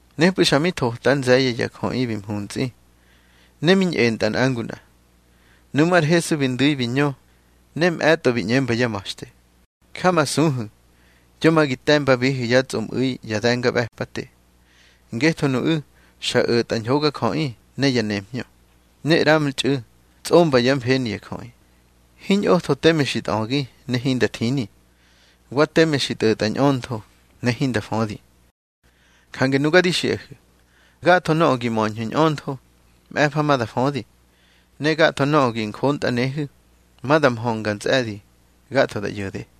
Nepꞌu̱ xa mi thota ár nze̱ye̱ ya jöꞌi bi mhuntsꞌi, ne mi ñꞌentꞌa nꞌa ngu nꞌa. Nuꞌmú̱ ar Hesu bi ndu̱i bi ñö, ne mꞌe̱tꞌo bi ꞌñemba yá ma̱xte: —Jamasuhu̱, yo ma gi te̱mbabihu̱ yá tsꞌomꞌu̱i ya de̱ngaꞌbe̱pate, ngetho nuꞌu̱ xa o̱tꞌa ñhogajöꞌi ne ya nemhñö, ne ꞌramtxꞌu̱ tsꞌomba yá mfeni ya jöꞌi. Hiñꞌotho teme xi tꞌögi ne hinda thini, wa teme xi tꞌo̱tꞌa ñꞌöntho ne hinda födi. Jange nuga di xiꞌahu̱, gatho nöꞌö gi möñhu̱ ñꞌöntho, mꞌe̱fa ma da födi. Ne gatho nöꞌö gi njontꞌanehu̱, ma da mhönga ntsꞌe̱di gatho da ꞌyo̱de.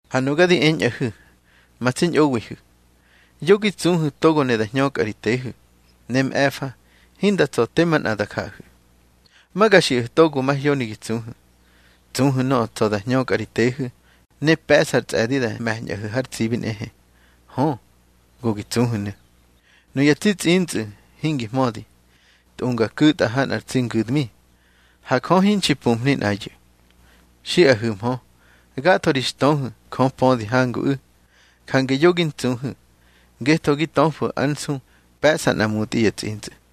Ha nuga di eñꞌahu̱, ma tsi ñꞌowiꞌihu̱, yo gi tsuhu̱ togo ne da hñökꞌahu̱ ri tehu̱, ne mꞌe̱fa hinda tsa̱ te manꞌa da jaꞌahu̱. Ma ga xiꞌahu̱ togo mahyoni gi tsuhu̱. Tsuhu̱ nöꞌö tsa̱ da hñökꞌa ri tehu̱, ne pe̱ꞌsa ar tsꞌe̱di da me̱ñꞌahu̱ har tsibi nꞌehe. Hö, go gi tsuhu̱nu̱. Nuya tsi tsꞌintsꞌu̱ hingi hmödi, tꞌunga ku̱tꞌa ha nꞌar tsi ngu̱dmi. Ha Jö hinxi pumhni nꞌayu̱. Xiꞌahu̱hmö. Gatho ri xtöhu̱ Jö pödi hanguꞌu̱. Jange yo gi ntsuhu̱, ngetho gi töfu̱ ár nsu pe̱ꞌsa nꞌa mutꞌi ya tsꞌintsꞌu̱.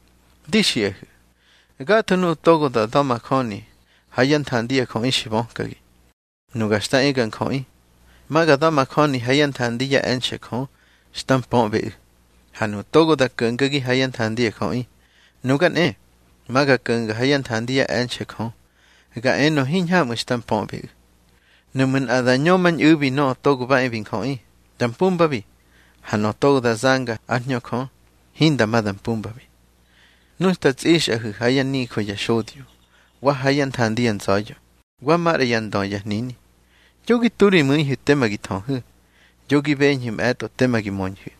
Di xiꞌahu̱, gatho nuꞌu̱ togo da da̱majöni ha yá nthandi ya jöꞌi xi bökagi, Nuga xta e ga Njöꞌi, ma ga da̱majöni ha yá nthandi yá e̱nxe̱ Jö xta mpöꞌbeꞌu̱. Ha nuꞌu̱ togo da ko̱ngagi ha yá nthandi ya jöꞌi, nuga nꞌe, ma ga ko̱nga ha yá nthandi yá e̱nxe̱ Jö, ga enö hiñhamꞌu̱ xta mpöꞌbeꞌu̱. Nuꞌmu̱ nꞌa da ñömañꞌu̱bi Nöꞌö Togo ba e bi Njöꞌi, da mpumbabi. Ha nöꞌö togo da zanga ár Hñö Jö, hinda ma da mpumbabi. Nu xta tsꞌixꞌahu̱ ha yá nijö ya xodyo, wa ha yá nthandi ya nza̱ya̱, wa maꞌra yá ndö ya hnini, yo gi tu ri mu̱ihu̱ tema gi thöhu̱, yo gi beñhu̱ mꞌe̱tꞌo tema gi möñhu̱.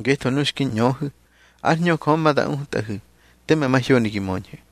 Ngetho nu xki ñöhu̱, ár Hñö Jö ma da utꞌahu̱ teme mahyoni gi möñhu̱.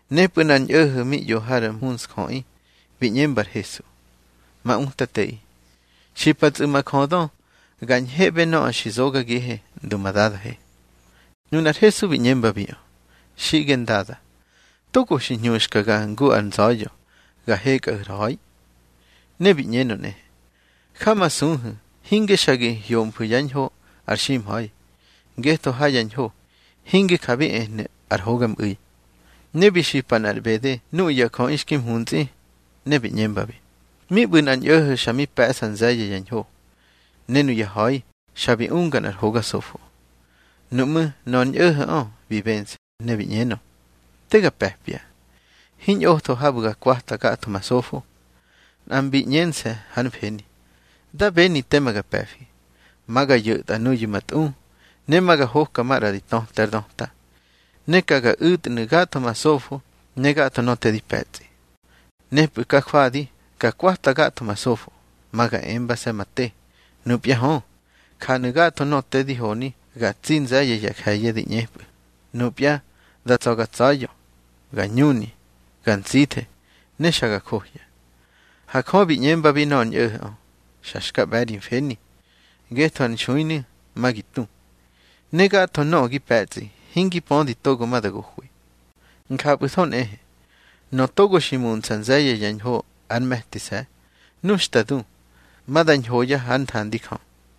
Nepꞌu̱ nꞌar ñꞌo̱ho̱ mi ꞌyo har mhuntsjöꞌi, bi ꞌñemba ar Hesu: —Ma Utateꞌi, xipatsꞌu̱ ma jödö ga ñheꞌbe nöꞌö bi zogagihe ndu ma dadahe. Nunar Hesu bi ꞌñembabiꞌö: —Xiꞌge Ndada, togo xi hñuxkaga ngu ar nza̱ya̱ ga hekꞌahu̱ ar ha̱i. Ne bi ꞌñenö nꞌe: —Jamasuhu̱ hinge xa gi hyomfu̱ yá ñho ar ximha̱i, ngetho ha ya ñho, hinge ja bi ehnu̱ ar hogamꞌu̱i. Ne bi xipa nꞌar ꞌbede nuꞌu̱ ya jöꞌi xki mhuntsꞌi, ne bi ꞌñembabi: —Mi ꞌbu̱ nꞌar ñꞌo̱ho̱ xa mi pe̱ꞌsa nze̱ye̱ ya ñho, ne nuyá ha̱i xa bi unga nꞌar hoga sofo. Nuꞌmú̱ nöꞌö ar ñꞌo̱ho̱ꞌö bi bense̱, ne bi ꞌñenö: Te ga pe̱pya. Hiñꞌotho habu̱ ga kwata gatho ma sofo. Nꞌa mbi ꞌñense̱ hár mfeni: Da beni tema ga pe̱fi. Ma ga yo̱tꞌa nuyu̱ ma tꞌu, ne ma ga hoka maꞌra di töte ár döta. Ne ka ga u̱tnu̱ gatho ma sofo ne gatho nöꞌö te di pe̱tsꞌi. Nepꞌu̱ ka jwadi ga kwata gatho ma sofo, ma ga embase̱ ma te: Nupya hö, janu̱ gatho nöꞌö te di honi ga tsi nze̱ye̱ ya je̱ye̱ da ꞌñepꞌu̱. Nupya da tsa̱ ga tsa̱ya̱, ga ñuni, ga ntsithe, ne xa ga njohya. Ha Jö bi ꞌñembabi nöꞌö ar ñꞌo̱ho̱ꞌö: Xa xka ꞌbe̱ ri mfeni, ngetho ar nxuinu̱, ma gi tu, ne gatho nöꞌö gi pe̱tsꞌi, hingi pödi togo ma da gohwi. Njapꞌu̱tho nꞌehe, nöꞌö togo xi muntsꞌa nze̱ye̱ ya ñho ár me̱tise̱, nu xta du, ma da ñhoya hár nthandi Jö.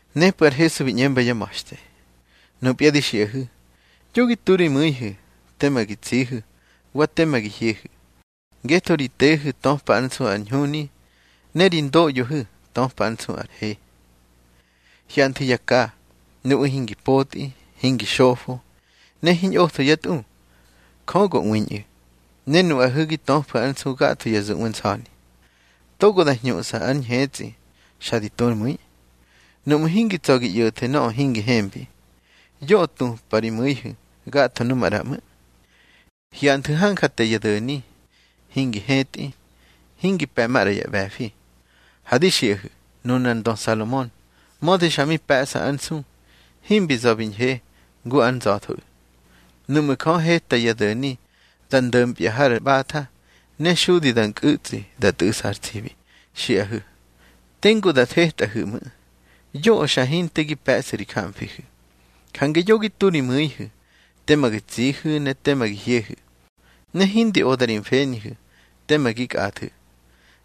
Nepꞌu̱ ar Hesu bi ꞌñemba yá ma̱xte: —Nupya di xiꞌahu̱, yo gi tu ri mu̱ihu̱ tema gi tsihu̱, wa tema gi hyehu̱. Ngetho ri tehu̱ töpa ár nsu ar ñhuni, ne ri ndoꞌyohu̱ töpa ár nsu ar he. Hyanthu̱ ya ka. Nuꞌu̱ hingi potꞌi, hingi xofo, ne hiñꞌotho yá tꞌu. Jö go ꞌwiñꞌu̱. Ne nuꞌahu̱ gi töfu̱ ár nsu gatho ya zuꞌwe nsa̱ni. Togo da hñuꞌsa ár ñhetsꞌi xa di tu ár mu̱i. Nuꞌmu̱ hingi tsa̱ gi ꞌyo̱thu̱ nöꞌö hingi hembi, yoꞌö tupꞌa ri mu̱ihu̱ gatho nu maꞌra ꞌmu̱. Hyanthu̱ hanja te ya do̱ni. Hingi hetꞌi, hingi pe̱ manꞌar ꞌbe̱fi. Ha di xiꞌahu̱, nunar ndö Salomon, mödi xa mi pe̱ꞌsa ár nsu, himbi za̱ bi ñhe ngu ár nza̱thoꞌu̱. Nuꞌmu̱ Jö heta ya do̱ni da ndo̱mpya har ꞌbatha, ne xudi da nkꞌu̱tsꞌi da tꞌu̱ꞌsa har tsibi, xiꞌahu̱, tengu da thetꞌahu̱ ꞌmu̱. Yoꞌö xa hinte gi pe̱ꞌsu̱ ri jamfihu̱. Jange yo gi tu ri mu̱ihu̱ tema gi tsihu̱ ne tema gi hyehu̱, ne hindi oda ri mfenihu̱ tema gi kꞌathu̱.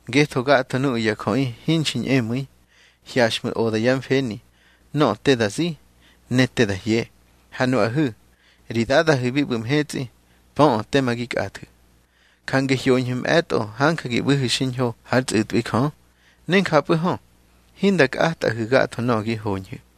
Ngetho gatho nuꞌu̱ ya jöꞌi hinxi ñꞌemu̱i, hyaxꞌmu̱ oda yá mfeni nöꞌö te da zi ne te da hye. Ha nuꞌahu̱, ri Dadahu̱ bi ꞌbu̱ mhetsꞌi, pöꞌö teme gi kꞌathu̱. Jange hyoñhu̱ mꞌe̱tꞌo hanja gi ꞌbu̱hu̱ xiñho hár tsꞌu̱tꞌwi Jö, ne njapꞌu̱ hö, hinda kꞌatꞌahu̱ gatho nöꞌö gi hoñhu̱.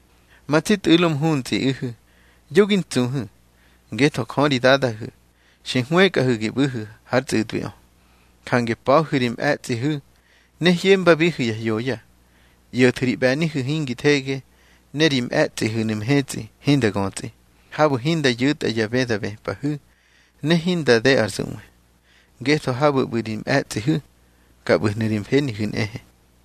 Ma tsi tꞌu̱lo mhuntsꞌiꞌihu̱, yo gi ntsuhu̱, ngetho Jö ri Dadahu̱ xi hwëkꞌahu̱ gi ꞌbu̱hu̱ hár tsꞌu̱tꞌwiꞌö. Jange pa̱hu̱ ri mꞌe̱tsꞌihu̱, ne hyembabihu̱ ya hyoya. ꞌYo̱thu̱ ri ꞌbe̱nihu̱ hingi thege, ne ri mꞌe̱tsꞌihu̱nu̱ mhetsꞌi hinda götsꞌi, habu̱ hinda yu̱tꞌa ya bë da bëpꞌahu̱, ne hinda de ar zuꞌwe. Ngetho habu̱ ꞌbu̱ ri mꞌe̱tsꞌihu̱, ka ꞌbu̱hnu̱ ri mfenihu̱ nꞌehe.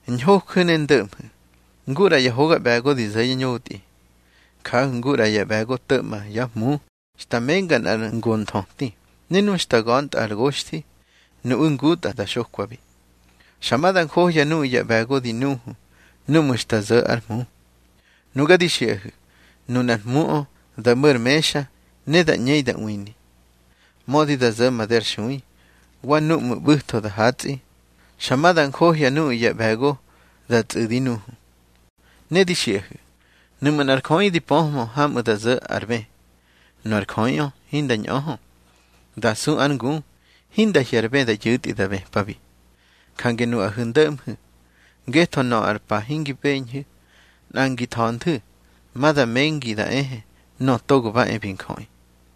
Ñhoju̱ ne ndo̱ꞌmhu̱, ngu ꞌra ya hoga ꞌbe̱go di zo̱ yá ñotꞌi. Jahu̱ ngu ꞌra ya ꞌbe̱go to̱ꞌma yá hmu xta menga nꞌar ngo nthöti, ne nu xta ga̱ntꞌa ar goxthi, nuꞌu̱ ngutꞌa da xokwabi. Xa ma da njohya nuꞌu̱ ya ꞌbe̱go di nuhu núꞌmu̱ xta zo̱ ár hmu. Nuga di xiꞌahu̱, nunar hmuꞌö da mo̱ ar mexa, ne da ꞌñei da ꞌwini. Mödi da zo̱ made ar xui, wa núꞌmu̱ ꞌbu̱tho da hatsꞌi, xa ma da njohya nuꞌu̱ ya ꞌbe̱go da tsꞌu̱di nuhu. Ne di xiꞌahu̱, nuꞌmu̱ nꞌar jöꞌi di pöhmö hamꞌu̱ da zo̱ ar bë, nu ar jöꞌiꞌö hinda ñꞌöhö, da su ár ngu, hinda hye̱ ar bë da yu̱tꞌi da bëpabi. Jange nuꞌahu̱ ndo̱ꞌmhu̱, ngetho nöꞌö ar pa hingi beñhu̱, nꞌa ngi tha̱ñhu̱tho, ma da mengi da ehe Nöꞌö Togo ba e bi Njöꞌi.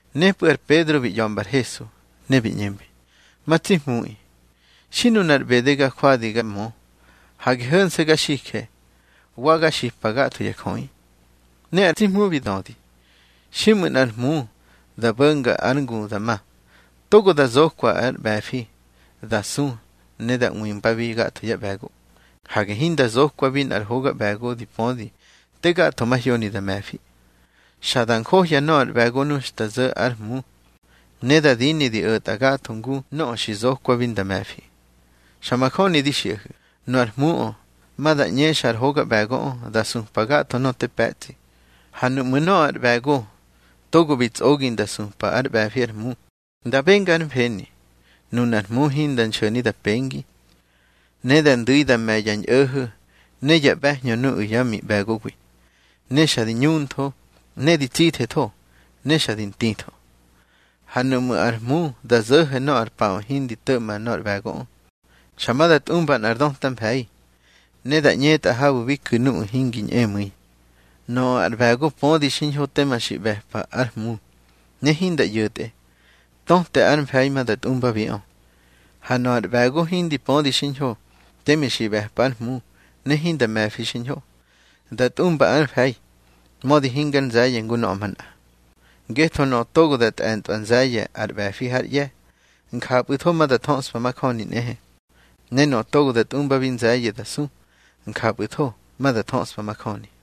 Nepꞌu̱ ar Pedro bi ꞌya̱mbar Hesu, ne bi ꞌñembi: —Ma tsi Hmuꞌi, xi nunar ꞌbede ga jwadi ga mö, hage ho̱nse̱ ga xije, wa ga xipa gatho ya jöꞌi. Ne ar tsi Hmu bi dödi: —Xiꞌmu̱ nꞌar hmu da bo̱nga ár ngu da ma, togo da zokwa ár ꞌbe̱fi da su ne da ꞌwimbabi gatho yá ꞌbe̱go. Hage hinda zokwabi nꞌar hoga ꞌbe̱go di pödi te gatho mahyoni da me̱fi. Xa da njohya nöꞌö ar ꞌbe̱go nu xta zo̱ ár hmu, ne da dini di o̱tꞌa gatho ngu nöꞌö xki zokwabi nda me̱fi. Xa majöni di xiꞌahu̱, nu ar hmuꞌö ma da ꞌñexa ar hoga ꞌbe̱goꞌö, da supa gatho nöꞌö te pe̱tsꞌi. Ha nuꞌmu̱ nöꞌö ar ꞌbe̱go togo bi tsꞌogi nda supa ár ꞌbe̱fi ár hmu, da benga hár mfeni, nunár hmu hinda nxo̱ni da pengi. Ne da ndu̱i da me̱ ya ñꞌo̱ho̱ ne ya ꞌbe̱hñö nuꞌu̱ yá miꞌbe̱gowi, ne xa di ñuntho, ne di tsithetho, ne xa di ntitho. Ha nuꞌmu̱ ár hmu da zo̱ho̱ nöꞌö ar paꞌö hindi to̱ꞌma nor ꞌbe̱goꞌö, xa ma da tꞌumba nꞌar döta mfe̱i, ne da ꞌñetꞌa habu̱ bi ku̱ nuꞌu̱ hingi ñꞌemu̱i. Nöꞌö ar ꞌbe̱go pödi xiñho tema xi ꞌbe̱pa ár hmu, ne hinda ꞌyo̱tꞌe, töte ár mfe̱i ma da tꞌumbabiꞌö. Ha nöꞌö ar ꞌbe̱go hindi pödi xiñho teme xi ꞌbe̱pa ár hmu ne hinda me̱fi xiñho, da tꞌumba ar mfe̱i, mödi hingar nze̱ye̱ ngu nöꞌö manꞌa. Ngetho nöꞌö togo da tꞌe̱ntꞌwa nze̱ye̱ ar ꞌbe̱fi hár ꞌye̱, njapꞌu̱tho ma da thöꞌspa majöni nꞌehe. Ne nöꞌö togo da tꞌumbabi nze̱ye̱ da su, njapꞌu̱tho ma da thöꞌspa majöni.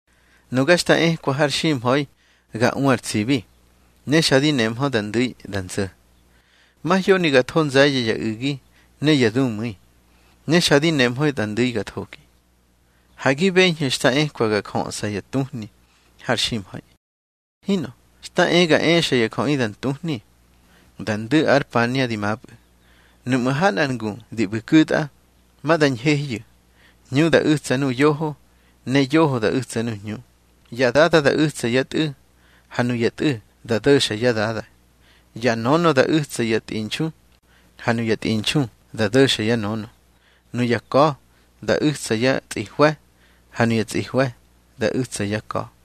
Nuga xta ekwa har ximha̱i ga u ar tsibi, ne xa di nehmö da ndu̱i da nzo̱. Mahyoni ga tho nze̱ye̱ ya u̱gi ne ya dumu̱i, ne xa di nehmö da ndu̱i ga thogi. Ha gi beñhu̱ xta ekwa ga jöꞌsa ya tuhni har ximha̱i. Hinꞌö, xta e ga exa ya jöꞌi da ntuhni. Da ndu̱ ar pania di mapꞌu̱, nuꞌmu̱ ha nꞌar ngu di ꞌbu̱ ku̱tꞌa, ma da ñhehyu̱, hñu da u̱tsa nu yoho, ne yoho da u̱tsa nu hñu. Ya dada da u̱tsa yá tꞌu̱, ha nuya tꞌu̱ da do̱xa yá dada. Ya nönö da u̱tsa yá tꞌinxu, ha nuya tꞌinxu da do̱xa yá nönö. Nuya ka̱ da u̱tsa yá tsꞌihwe̱, ha nuya tsꞌihwe̱ da u̱tsa yá ka̱.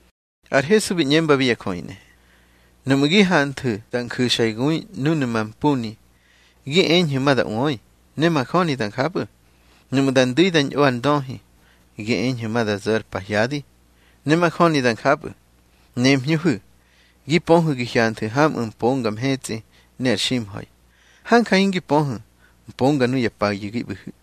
Ar Hesu bi ꞌñembabi ya jöꞌi nꞌehe: —Núꞌmu̱ gi hanthu̱ da nju̱xa ya gui núnu̱ mampuni, gi eñhu̱ ma da ꞌwöi, ne majöni da njapꞌu̱. Nuꞌmu̱ da ndu̱i da ñꞌo ar ndöhi, gi eñhu̱ ma da zo̱ ar pahyadi, ne majöni da njapꞌu̱. Nemhñöhu̱. Gi pöhu̱ gi hyanthu̱ hamꞌu̱ mponga mhetsꞌi ne ar ximha̱i, hanja hingi pöhu̱ mponga nuya payu̱ gi ꞌbu̱hu̱.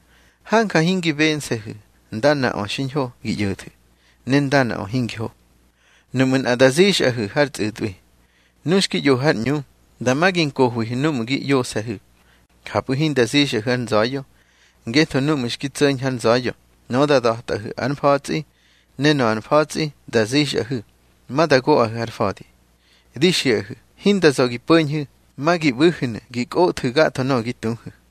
Hanja hingi bense̱hu̱ ndanaꞌö xiñho gi ꞌyo̱thu̱, ne ndanaꞌö hingi ho. Nuꞌmu̱ nꞌa da zixꞌahu̱ har tsꞌu̱tꞌwi, nu xki ꞌyohu̱ har ꞌñu, dama gi nkohwihu̱ núꞌmu̱ gi ꞌyose̱hu̱, njapꞌu̱ hinda zixꞌahu̱ har nza̱ya̱. Ngetho núꞌmu̱ xki tso̱ñhu̱ har nza̱ya̱, nöꞌö da da̱tꞌahu̱ ár mfa̱tsꞌi, ne nöꞌö ár mfa̱tsꞌi da zixꞌahu̱, ma da goꞌahu̱ har fa̱di. Di xiꞌahu̱ hinda za̱ gi po̱ñhu̱, ma gi ꞌbu̱hu̱nu̱ gi kꞌothu̱ gatho nöꞌö gi tuhu̱.